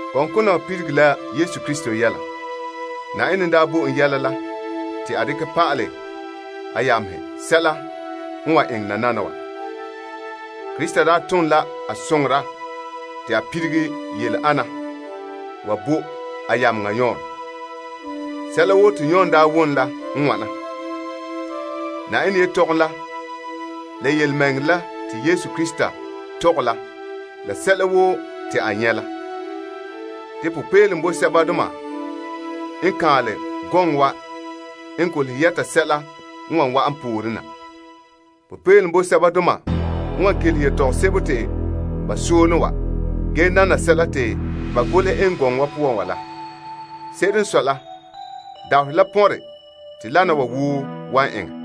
Gɔŋkona wa liligere la Yesu Krista yɛla, Yenɛ n bo en yɛla la te a dekɛ pa'alɛ a yamehe sɛla n wan eŋɛ nananawa. A tom la a soŋora te a lilige yɛla ana wa bo a yameŋa Yon. Sɛla woo te Yon wom n la wana: Yenɛ yelehom la, la yelemɛŋɛrɛ la te Yesu Krista tɔgɛ la la sɛla woo te a nyɛ' la. Popeelom boe sɛbadoma n kaanlɛ gɔŋkona wa n golehɛ yɛta sɛla n wan wa'an pooren na. Popeelom boe sɛbadoma n kelehe yetɔgom sebo te ba mɔɔlɛ wa ge nana sɛla te ba golehe eŋɛ gɔŋɔ wa poan wa la. Se'ere n sɔe la, dabaherɛ la pɔnre te wana wa woo wan eŋɛ.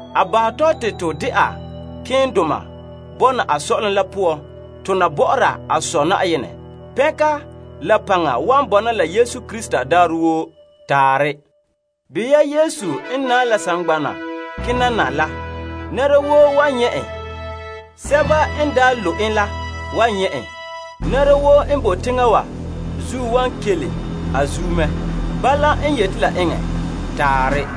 A bahɛ tɔ te to dɛna malemadoma buuri bɔna a Sɔ'ɔlom la poan tona bɔ'ɔra a Sɔ' Yenɛ. Pɛnka la paŋa wan bɔna la Yesu Krista daarɛ woo. Taarɛ. Behɛ ya Yesu n bala n ze'ele saŋgbana zuo kena na la. Nɛra woo wan nyɛ' en, la sɛba n daa lo' en la kanɛ la wan nyɛ' en. Nɛra woo n boe teŋa wa zuo wan kele a zuo mɛ. Bala n yeti la eŋɛ. Taarɛ.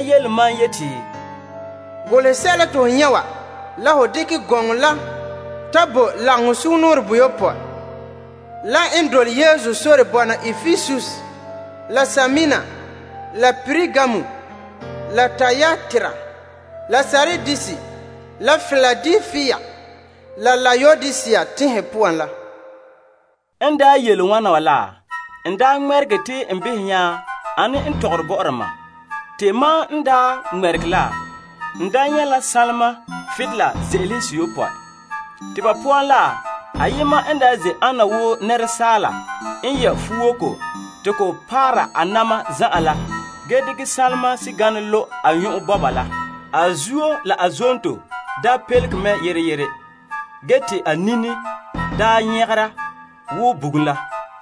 yeti, Golehɛ sɛla te ho nyɛ' wa la ho dekɛ gɔŋɔ la ta bo lagaŋɔ toyopɔe la n boe Epesus la Smirna la Pergamum la Tiatira la Sardis la Piladelpia la Laodisea tenhen poan la. Te mam ŋmɛregɛ te n behɛ ane n tɔgɔre bɔ'ɔra mam. Te mam n ŋmɛregɛ, n daa nyɛ' la sanlema butolela ze'elehe bonkanra seyopɔe. Te ba teŋasoka, sɛla n daa ze' ana wo asaala yɛ' fuwoko te ko paara a na'ma zan'an la te sanlema sɛganɛ kantɛ lo' a nyɔn'ɔn bɔba la. A zuo la a zonto daa pelege mɛ yere yere. Ge te a nini daa nyagera wo bugum la.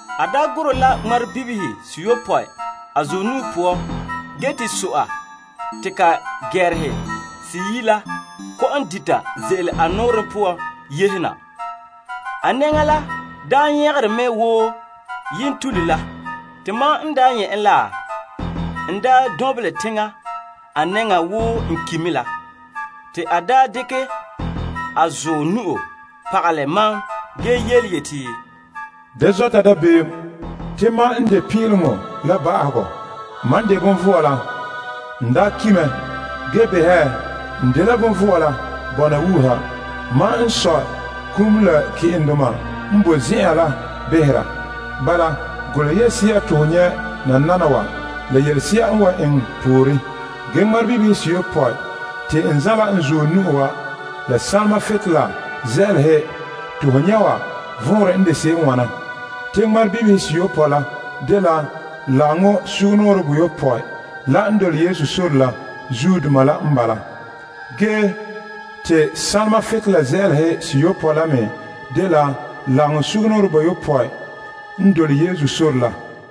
A gurɛ la ŋmarebibihe seyopɔe a zuɔ nu'o, te so'a te ka gɛɛrehe seyi' la dita ze'ele a nɔɔrɛ poan yehe na. A nɛŋa la daa nyagere mɛ wo yentule la. Te mam n nyɛ' en la, n daa lu' la a nɛŋan wo n ki' me la. Te a dekɛ a zuɔ nu'o pagalɛ mam ge yeti, Da zɔta dabeem. Te mam n de Pin'ileŋɔ la Ba'ahegɔ. Mam vɔe mɛ. N daa ki' mɛ, ge behɛ, n vɔe mɛ, bɔna wuuha. Mam n sɔe kum la ke'endoma n boe zen'an la behera. Bala, golehɛ yelese'a to ho nyɛ' nananawa la yelese'a n wan eŋɛ pooren. Ge ŋmarebibihe seyopɔe la te n zanla n zuɔ nu'o wa la sanlema butolela ze'elehe te ho nyɛ' wa vɔnrɛ dela. Te ŋmarebibihe seyopɔe la dela lagaŋɔ toyopɔe la soŋoreba n bala. Ge te sanlema butolela ze'elehe seyopɔe la me dela lagaŋɔ toyopɔe la.